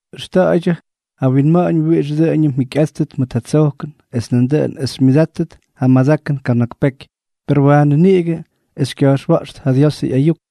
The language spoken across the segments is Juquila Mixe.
Ʉxta̱ꞌa̱ydyʉ ja winma̱ꞌa̱ñ wiꞌix dʉꞌʉñʉm mjikyꞌáttʉt mʉt ja tsojkʉn, es nandʉꞌʉn es xymyʉdáttʉt ja madakʉn kana̱k peky, per waanʉ niꞌigʉ es xykya̱jxwa̱ꞌxʉt ja Diosʉ ꞌyayuk.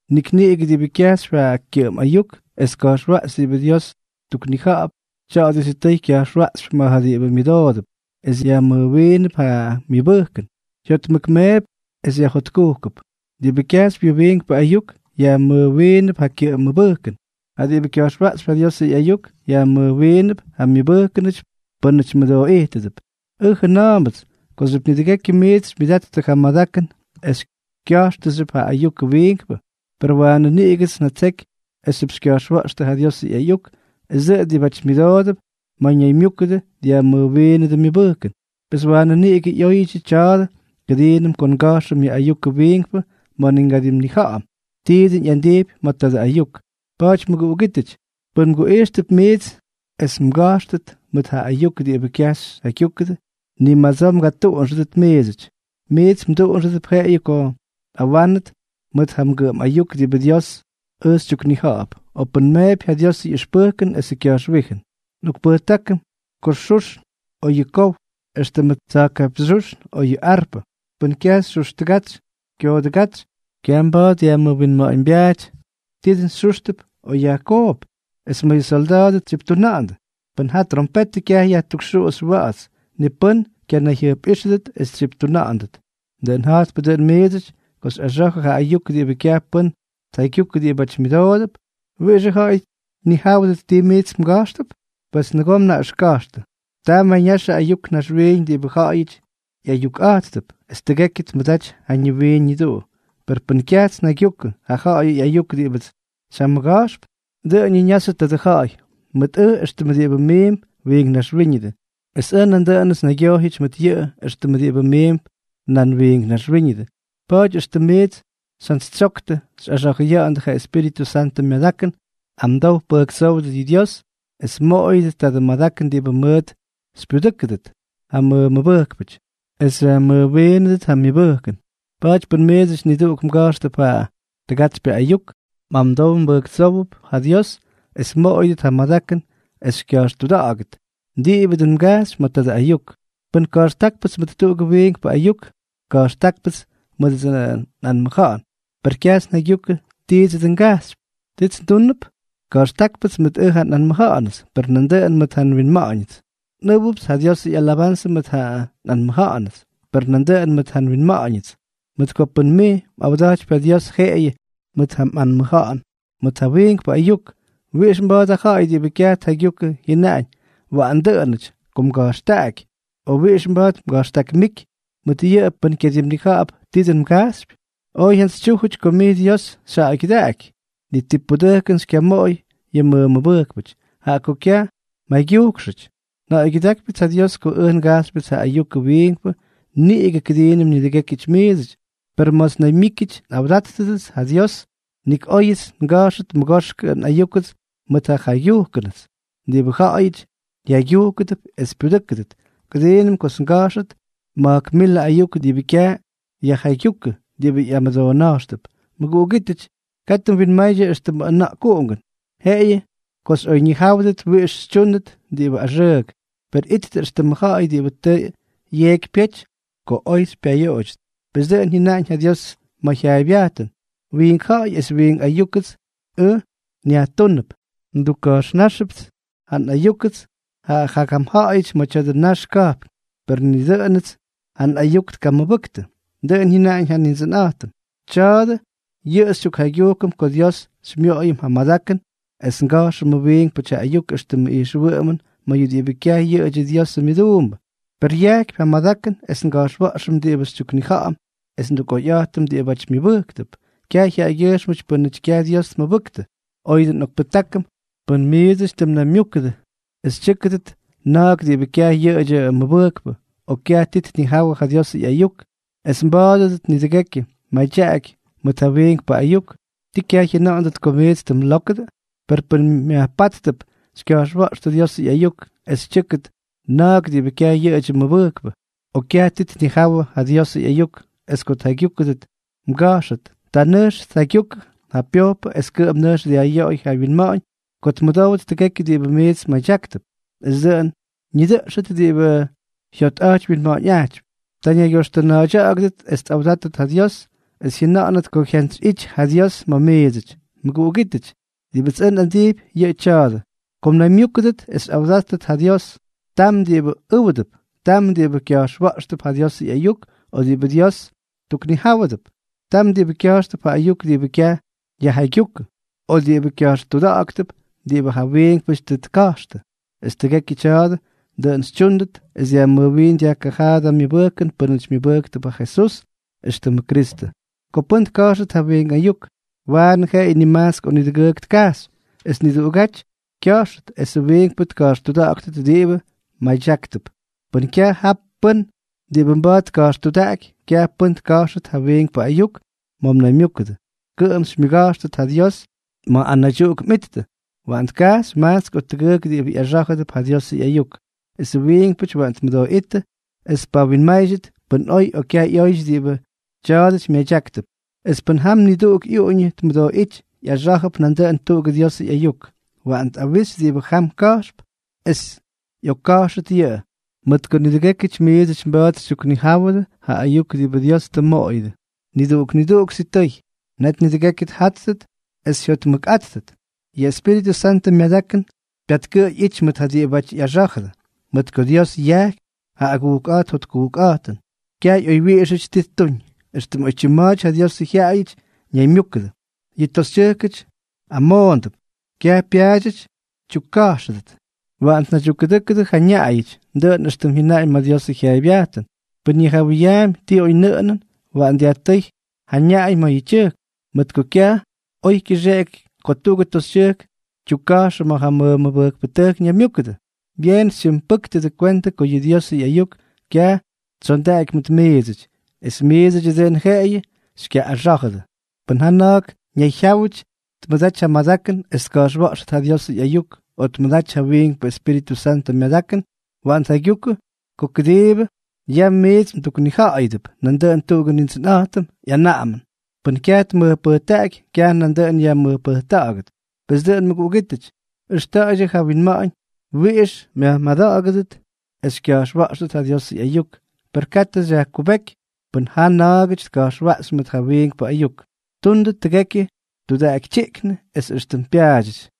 Nik niꞌigʉ diꞌibʉ kyajxypy ja kyʉꞌʉm ayuk es tka̱jxwaꞌxy diꞌibʉ Dios tuknija̱ꞌa̱p, tya̱a̱dʉ sitʉy kya̱jxwaꞌxypy ma̱ ja diꞌibʉ myʉdoodʉp, es yajmʉjwiinʉp ja myʉbʉjkʉn, jyotmʉkmeepy es yajjotkujkʉp. Diꞌibʉ kyajxypy yʉ wiinkpʉ ayuk, yajmʉjwiinʉp ja kyʉꞌʉm mʉbʉjkʉn. Ja diꞌibʉ kya̱jxwaꞌxypy ja Diosʉ ꞌyayuk, yajmʉjwiinʉp ja myʉbʉjkʉnʉty pʉ́nʉty mʉdooꞌijtʉdʉp. Ʉj jajʉna̱a̱mbʉts kooxyʉp nidʉgekyʉ miits xymyʉdattʉ ja madakʉn es xykya̱jxtʉxyʉp ja ayukʉ wiinkpʉ. Per waanʉ niꞌigʉts njatseky esxyʉp xykya̱jxwa̱ꞌxtʉ ja Diosʉ ꞌyayuk es dʉꞌʉn diꞌibáty myʉdoodʉp ma̱ mnaymyúkʉdʉ dyajmʉjwiinʉdʉ myʉbʉjkʉn. Pes waanʉ niꞌigʉ ꞌyóyʉdyʉ tya̱a̱dʉ kʉdiinʉm ko nga̱jxʉm ja ayukʉ wiinkpʉ ma̱ ni ngadimnija̱ꞌa̱m ti dʉn ꞌyandijpy ma̱ tadʉ ayuk. Pa̱a̱ty mʉguꞌugítʉty, pʉn nguꞌijxtʉp miits es nmʉga̱jxtʉt mʉt ja ayuk diꞌibʉ kyaj xyjaygyúkʉdʉ, ni madsoo mgatuꞌunxʉdʉt miidsʉty. Miits mduꞌunxʉdʉp jeꞌeyʉ ko nꞌawánʉdʉt mʉt ja mgʉꞌʉm ayuk diꞌibʉ Diósʉts ʉj xytyuknija̱ꞌa̱p, o pʉn nmeepy ja Diosʉ ꞌyʉxpʉjkʉn esʉ kya̱jxwíjʉn. Nꞌokpʉjtákʉm yʉ xuxn o yʉ kow, éxtʉmʉ tsa̱jkapyñxyúxn o yʉ arpʉ, pʉn kyaj xyuxtʉgatsy kyoodʉgátsy, kyaj mba̱a̱t yajmʉwinma̱ꞌa̱ñbyaaty ti dʉn yajxúxp o yajkoop. Es ma̱ yʉ solda̱a̱dʉ tsyiptuna̱ꞌa̱ndʉ, pʉn ja trompetʉ kyaj yajtukxuꞌuxy wa̱ꞌa̱ts, ni pʉ́n kyanayjyʉjpꞌíxʉdʉt es tsyiptuna̱ꞌa̱nʉt. Dʉꞌʉn ja̱jtpʉ dʉꞌʉn mʉt miidsʉty ko xykya̱jxtʉ ja ayuk diꞌibʉ kyaj pʉ́n tjaygyukʉ diꞌibáty myʉdoodʉp, ¿wiꞌixʉ ja̱ꞌa̱y tnijáwʉdʉt ti miits mga̱jxtʉ? ¡Pes nʉgoo mnaꞌʉxka̱jxtʉ! Ta mayñaxʉ ayuk naxwiiñ diꞌibʉ ja̱ꞌa̱yʉty ꞌyayukꞌa̱jttʉp, es tʉgekyʉ tmʉdaty ja ñiwiin ñiduꞌu. Per pʉn ʉj kyajts njaygyukʉ ja ja̱ꞌa̱yʉ ꞌyayuk diꞌibʉts xyjamʉga̱jxp, dʉꞌʉn ñaxyʉ tadʉ ja̱ꞌa̱y mʉt ʉj éxtʉm diꞌibʉ miimp wiink naxwíñʉdʉ, es ʉj nandʉꞌʉnʉts nnaygyojyʉty mʉt yʉꞌʉ éxtʉmʉ diꞌibʉ miimp nan wiink naxwíñʉdʉ. Pa̱a̱ty éxtʉm miits xyjantsytsyoktʉ xyꞌaxa̱jʉya̱ꞌa̱ndʉ ja Espíritʉ Santʉ myadakʉn, amdow pʉjktsów yʉ Dios es mmoꞌoyʉdʉt tadʉ madakʉn diꞌibʉ mʉʉt xypyudʉ́kʉdʉt ja mmʉmʉbʉjkpʉty es xyajmʉjwiinʉdʉt ja myʉbʉjkʉn. Pa̱a̱ty pʉn miidsʉty niduꞌuk mga̱jxtʉp ja tʉgatsypyʉ ayuk, mꞌamdow mbʉjktsówʉp ja Dios es mmoꞌoyʉdʉt ja madakʉn es xykya̱jxtuda̱ꞌa̱gʉt diꞌibʉ dʉn mgajxypy ma̱ tadʉ mꞌayuk. Pʉn ka̱jxtákpʉts mʉt tuꞌugʉ wiinkpʉ ayuk, ka̱jxtákpʉts mʉdʉdsʉ nꞌanmʉja̱ꞌa̱n, per kyajts njaygyukʉ ti dʉn ngajxypyʉts. ¿Tits ndúnʉp? Ka̱jxtákpʉts mʉt ja nꞌanmʉja̱ꞌa̱nʉts, per nandʉꞌʉn mʉt ja nwinma̱ꞌa̱ñʉts. Nꞌʉ́wʉpts ja Diosʉ ꞌyalabanzʉ mʉt ja nꞌanmʉja̱ꞌa̱nʉts, per nandʉꞌʉn mʉt ja nwinma̱ꞌa̱ñʉts. Mʉt ko pʉn mij mꞌawda̱jtypy ja Dios jeꞌeyʉ mʉt ja mꞌanmʉja̱ꞌa̱n mʉt ja wiinkpʉ ayuk, ¿wiꞌix mba̱a̱t ja ja̱ꞌa̱y diꞌibʉ kyaj tjaygyukʉ jyʉnaꞌañ “waꞌan dʉꞌʉnʉty” ko mga̱jxtakta̱ꞌa̱y, o wiꞌix mba̱a̱t mga̱jxtakmíky mʉt yʉꞌʉ pʉn kyadimnija̱ꞌa̱p ti dʉn mgajxypy? Oy jyantsytsyújʉty ko mij Dios xyjaꞌaygyʉdaꞌaky, ni ti pudʉjkʉn xykyamoꞌoy yʉ mmʉmʉbʉjkpʉty, jaꞌa ko kyaj mjaygyujkxʉty. Nja̱ꞌa̱ygyʉdákypyʉts ja Dios ko ʉj ngajxypyʉts ja ayukʉ wiinkpʉ niꞌigʉ kʉdiinʉm nidʉgékyʉty miidsʉty. Per ma̱ts nnaymyíkyʉty nꞌawdata̱ꞌa̱ndʉts ja Dios, nik óyʉts nga̱jxʉt mʉgoxkʉ nꞌayúkʉts mʉt ja njaygyujkʉnʉts diꞌibʉ ja̱ꞌa̱yʉty jyaygyúkʉdʉp es pyudʉ́kʉdʉt, kʉdiinʉm kots nga̱jxʉt ma̱jk milʉ ayuk diꞌibʉ kyaj yajjaygyúkʉ diꞌibʉ ꞌyamʉdoona̱jxtʉp. Mʉguꞌugítʉty, katʉ mwinmaydyʉ éxtʉmʉ ʉna̱ꞌkuꞌungʉn, jeꞌeyʉ ko xykyaꞌoyñijáwʉdʉ wiꞌix xytyúndʉt diꞌibʉ axʉʉk. Per ittʉ éxtʉmʉ ja̱ꞌa̱y diꞌibʉ tʉ yeeky tʉ pyety ko oy xypyayoꞌoydyʉt. Pes dʉꞌʉn jyʉnaꞌañ ja Dios ma̱ jyaaybyajtʉn: “Wiink ja̱ꞌa̱y es wiink ayúkʉts ʉj nyajtúnʉp, ndukka̱jxnáxʉpts ʉj ja nꞌayúkʉts ja jagam ja̱ꞌa̱yʉty ma̱ tya̱dʉ nax ka̱jpn, per ni dʉꞌʉnʉts ja nꞌayuk tkamʉbʉktʉ”, dʉꞌʉn jyʉnaꞌañ ja Nindsʉnꞌa̱jtʉm. Tya̱a̱dʉ yʉꞌʉ xytyukjaygyujkʉm ko Dios xymyoꞌoyʉm ja madakʉn es nga̱jxʉmʉ wiinkpʉty ja ayuk éxtʉmʉ ijxwʉꞌʉmʉn ma̱ yʉ diꞌibʉ kyaj yʉꞌʉdyʉ Diosʉ myʉduumbʉ, per yajkypy ja madakʉn es nga̱jxwa̱ꞌxʉm diꞌibʉ xytyuknija̱ꞌa̱m es ndukꞌoyꞌa̱jtʉm diꞌibáty myʉbʉjktʉp, kyaj jyaꞌagyʉjxmʉty pʉ́nʉty kyaj Dios tmʉbʉktʉ. Oyʉ dʉꞌʉn, nꞌokpʉjtákʉm pʉn miidsʉty tʉ mnaymyúkʉdʉ, es tyʉ́kʉdʉt na̱a̱k diꞌibʉ kyaj yʉꞌʉdyʉ mʉmʉbʉjkpʉ o kyaj ti tnijáwʉdʉ ja Diosʉ ꞌyayuk, es mba̱a̱dʉdʉt nidʉgekyʉ mmadyaꞌaky mʉt ja wiinkpʉ ayuk, ¿tii kyaj jyʉna̱ꞌa̱ndʉt ko miits tʉ mlókʉdʉ? Per pʉn myajpáttʉp xykya̱jxwa̱ꞌxtʉ Diosʉ ꞌyayuk es tyʉ́kʉt na̱a̱k diꞌibʉ kyaj yʉꞌʉdyʉ mʉmʉbʉjkpʉ o kyaj ti tnijáwʉdʉ ja Diosʉ ꞌyayuk, es ko tjaygyúkʉdʉ mgajxyʉty, ta nʉjx tjaygyukʉ ja pyojpʉ es kʉꞌʉm nʉjx dyajꞌyoꞌoy ja wyinma̱ꞌa̱ñ ko tmʉdówʉt tʉgekyʉ diꞌibʉ miits mmadyáktʉp, es dʉꞌʉn ñidʉꞌxʉt diꞌibʉ jyotꞌa̱jty wyinma̱ꞌa̱ñꞌajtypy. Ta ñaygyoxtʉna̱a̱ydya̱ꞌa̱gʉdʉt es tꞌawdátʉt ja Dios, es jyʉna̱ꞌa̱nʉt ko jyantsyꞌity ja Dios ma̱ miidsʉty. Mʉguꞌugítʉty, diꞌibʉts ʉj nꞌandijpy, yʉꞌʉ tya̱a̱dʉ: Ko mnaymyúkʉdʉt es xyꞌawdata̱ꞌa̱ndʉt ja Dios, tam diꞌibʉ ʉ́wdʉp, tam diꞌibʉ kya̱jxwa̱ꞌxtʉp ja Diosʉ ꞌyayuk o diꞌibʉ Dios tuknijáwʉdʉp, tam diꞌibʉ kya̱jxtʉp ja ayuk diꞌibʉ kyaj yajjaygyúkʉ, o diꞌibʉ kya̱jxtuda̱ꞌa̱ktʉp diꞌibʉ ja wiinkpʉty tʉ tka̱jxtʉ; es tʉgekyʉ tya̱a̱dʉ, dʉꞌʉn xytyúndʉt es dyajmʉjwiin dyajkajaadʉ myʉbʉjkʉn pʉ́nʉty myʉbʉjktʉp ja Jesús éxtʉmʉ Kristʉ. Ko pʉ́n tka̱jxʉt ja wiink ayuk, waꞌan jeꞌeyʉ nimajtsk o nidʉgʉʉk tkajxy, es niduꞌugáty kya̱jxʉt, esʉ wiinkpʉ tka̱jxtuda̱ꞌa̱ktʉt diꞌibʉ mmadyáktʉp. Pʉn kyaj jap pʉ́n diꞌibʉ mba̱a̱t tka̱jxtudaꞌaky, kyaj pʉ́n tka̱jxʉt ja wiinkpʉ ayuk ma̱ mnaymyúkʉdʉ, kʉꞌʉm xymyʉga̱jxtʉt ja Dios ma̱ anaydyuꞌuk mꞌittʉ. Waꞌan tkajxy majtsk o tʉgʉʉk diꞌibʉ ꞌyaxá̱jʉdʉp ja Diosʉ ꞌyayuk, esʉ wiinkpʉty waꞌan tmʉdooꞌíttʉ es tpawinmáydyʉt pʉn oy o kyaj ꞌyóyʉty diꞌibʉ tya̱a̱dʉty myadyáktʉp. Es pʉn jam niduꞌuk ꞌyuꞌuñʉ tmʉdooꞌíty ꞌyaxá̱jʉp nandʉꞌʉn tuꞌugʉ Diosʉ ꞌyayuk, waꞌan tꞌawixy diꞌibʉ jam ka̱jxp, es ꞌyokka̱jxʉt yʉꞌʉ. Mʉt ko nidʉgékyʉty miidsʉty mba̱a̱t xytyuknijáwʉdʉ ja ayuk diꞌibʉ Dios tʉ mmoꞌoyʉdʉ, niduꞌuk niduꞌuk sitʉy. Net nidʉgekyʉ tjáttʉt es jyotmʉkꞌáttʉt. Yʉ Espíritʉ Santʉ myadakʉn pyatkʉꞌʉy ꞌyity mʉt ja diꞌibáty ꞌyaxá̱jʉdʉ, mʉt ko Dios yajkypy ja agujkꞌa̱jt jotkujkꞌa̱jtʉn, kyaj oywyiꞌixʉty ti ttuñ. Extʉm oytyim ma̱a̱ty ja Diosʉ jyaꞌayʉty ñaymyúkʉdʉ, yʉ toxytyʉjkʉty amoondʉp. Kyaj pyaadyʉty tyukka̱jxʉdʉt. Waꞌan tnaydyukkʉdʉ́kʉdʉ ja ñaꞌayʉty, dʉꞌʉn éxtʉm jyʉnaꞌañ ma̱ yʉ Diosʉ jyaaybyajtʉn. Pʉn ñijawʉyaampy ti oynʉꞌʉnʉn, waꞌan dyajtʉ́y ja ñaꞌay ma̱ yʉ tyʉjk. Mʉt ko kyaj oy kyʉxeꞌeky ko tuꞌugʉ toxytyʉjk tyukka̱jxʉ ma̱ ja mʉbʉjkpʉtʉjk ñaymyúkʉdʉ. Byeen xytyimpʉ́ktʉdʉ kwentʉ ko yʉ Diosʉ ꞌyayuk kyaj tsyondaky mʉt miidsʉty, es ni miidsʉdyʉ dʉn jeꞌeyʉ xykyaꞌꞌaxá̱jʉdʉ. Pʉn ja na̱a̱k ñayjyáwʉty tmʉdaty ja madakʉn es tka̱jxwa̱ꞌxʉt ja Diosʉ ꞌyayuk, o tmʉdaty ja wiinkpʉ Espíritʉ Santʉ myadakʉn, waꞌan tjaygyukʉ ko diꞌibʉ yam miits nduknija̱ꞌa̱yʉdʉp, yʉꞌʉ dʉꞌʉn tuꞌugʉ Nindsʉnꞌa̱jtʉmʉ ꞌyanaꞌamʉn. Pʉ́n kyaj tmʉjpʉjtaꞌaky, kyaj nandʉꞌʉn yajmʉjpʉjta̱ꞌa̱gʉt. Pes dʉꞌʉn mʉguꞌugítʉty, ʉxta̱ꞌa̱ydyʉ ja winma̱ꞌa̱ñ wiꞌix myajmada̱ꞌa̱gʉdʉt es xykya̱jxwa̱ꞌxʉt ja Diosʉ ꞌyayuk, per katʉ xyajkubéky pʉn jaa na̱a̱gʉty tka̱jxwaꞌxy mʉt ja wiinkpʉ ayuk. Tundʉ tʉgekyʉ tudaꞌakytyiꞌknʉ es éxtʉm pyaadyʉty.